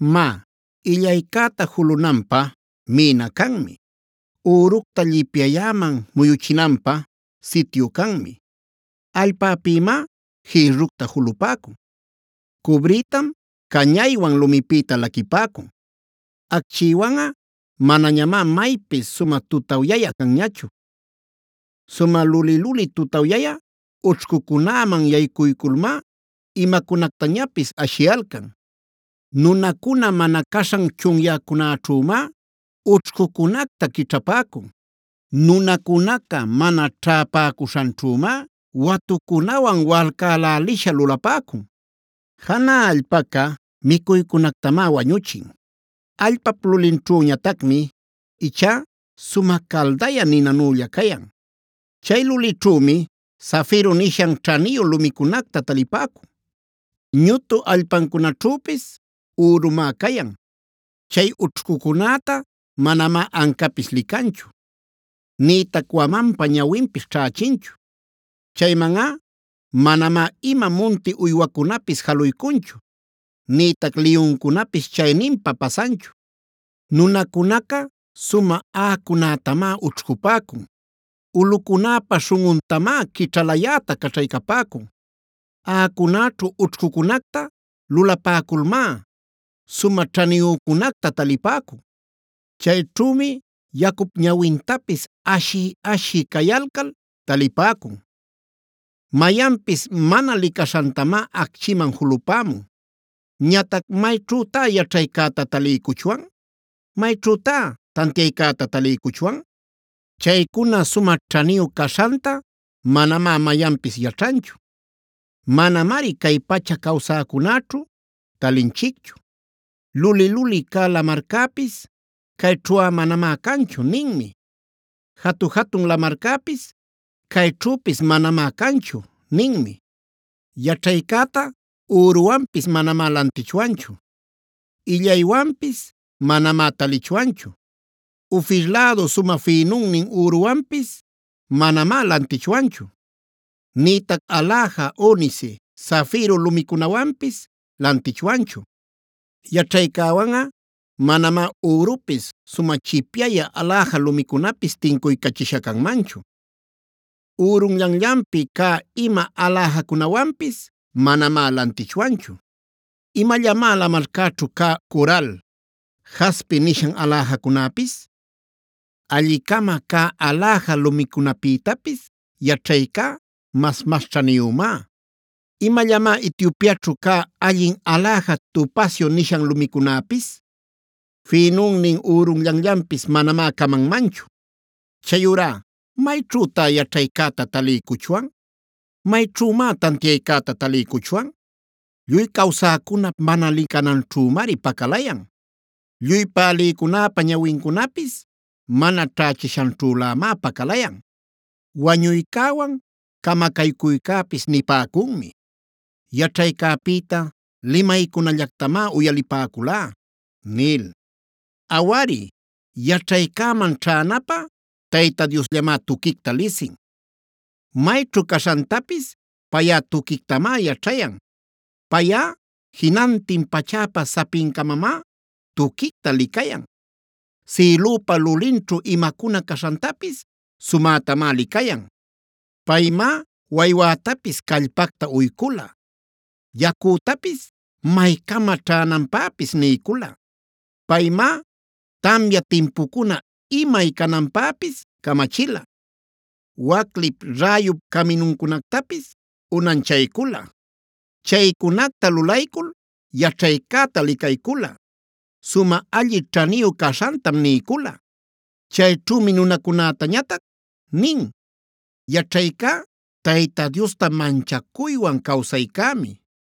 “Má, illaycäta julunanpä mïna canmi. Üructa llipyayäman muyuchinanpä sityu canmi. Allpäpïmá jïrructa julapäcun; cubrïtam cañaywan lumipïta laquipäcun. Acchïwanꞌa manañamá maypis sumä tutawyayä canñachu. Sumä luli-luli tutawyayä ućhcucunäman yaycuyculmá imacunactañapis ashiyalcan. Nunacuna mana caśhan chunyäcunäćhümá, ućhcucunacta quićhapäcun. Nunacunaca mana ćhäpäcuśhanćhümá, watucunawan walcacälälisha lulapäcun. Janä allpaca micuycunactamá wayuchin; allpap lulinćhüñatacmi ichá sumä caldayä ninanülla cayan. Chay lulićhümi zafiro nishan ćhaniyu lumicunacta talipäcun; ñutu allpancunaćhüpis ürumá cayan. Chay ućhcucunäta manamá ancapis licanchu; nïtac wamanpa ñawinpis ćhächinchu. Chaymanꞌa manamá ima munti uywacunapis jaluycunchu; nïtac liyuncunapis chayninpá pasanchu. Nunacunaca sumä aꞌacunätamá ućhcupäcun; ulꞌucunäpa śhunꞌuntamá quićhalayäta caćhaycapäcun. Aꞌacunäćhu ućhcucunacta lulapäculmá, sumä ćhaniyücunacta talipäcun. Chayćhümi yacup ñawintapis ashiy-ashiy cayalcal talipäcun; mayanpis mana licaśhantamá acchiman julapämun. “Ñatac ¿mayćhütá yaćhaycäta taliycuchwan? ¿Mayćhütá tantiaycäta taliycuchwan? Chaycuna sumä ćhaniyu caśhanta manamá mayanpis yaćhanchu; manamari cay pacha cawsäcunäćhu talinchicchu. Luli-luli cä lamarcäpis: ‘Cayćhuꞌa manamá canchu’ ninmi. Jatu-jatun lamarcäpis: ‘Cayćhüpis manamá canchu’ ninmi. Yaćhaycäta üruwanpis manamá lantichwanchu; illaywanpis manamá talichwanchu. Ofir lädu sumä fïnunnin üruwanpis manamá lantichwanchu; nïtac aläja onice, zafiro lumicunawanpis lantichwanchu. Yaćhaycäwanꞌa manamá ürupis, sumä chipyayä aläja lumicunapis tincuycachisha canmanchu. Ürunllanllanpi cä ima aläjacunawanpis manamá lantichwanchu. ¿Imallamá lamarcäćhu cä coral, jaspe nishan aläjacunäpis? Alli-cama cä aläja lumicunapïtapis yaćhaycá mas-mas ćhaniyümá. ¿Imallamá Etiopiaćhu cä allin aläja topacio nishan lumicunäpis? Fïnunnin ürunllanllanpis manamá camanmanchu. “Chayurá ¿mayćhütá yaćhaycäta taliycuchwan? ¿Mayćhümá tantiaycäta taliycuchwan? Lluy cawsäcunap mana licananćhümari pacalayan. Lluy pälïcunäpa ñawincunapis mana ćhächishanćhülämá pacalayan. Wañuycäwan Camacaycuycäpis nipäcunmi: ‘Yaćhaycäpïta limaycunallactamá uyalipäculá’ nil. “Awari, yaćhaycäman ćhänapä Tayta Diosllamá tuquicta lisin. Mayćhu caśhantapis payꞌa tuquictamá yaćhayan. Payꞌa jinantin pachäpa sapincamamá tuquicta licayan; sïlüpa lulinćhu imacuna caśhantapis sumätamá licayan. Paymá waywätapis callpacta uycula, yacütapis maycama ćhänanpäpis niycula. Paymá tamya timpucuna imay cananpäpis camachila, waclip, räyup caminuncunactapis unanchaycula. Chaycunacta lulaycul yaćhaycäta licayculꞌa sumä alli ćhaniyu caśhantam niycula.a Chayćhümi nunacunätañatac nin: ‘Yaćhaycá Tayta Diosta manchacuywan cawsaycämi.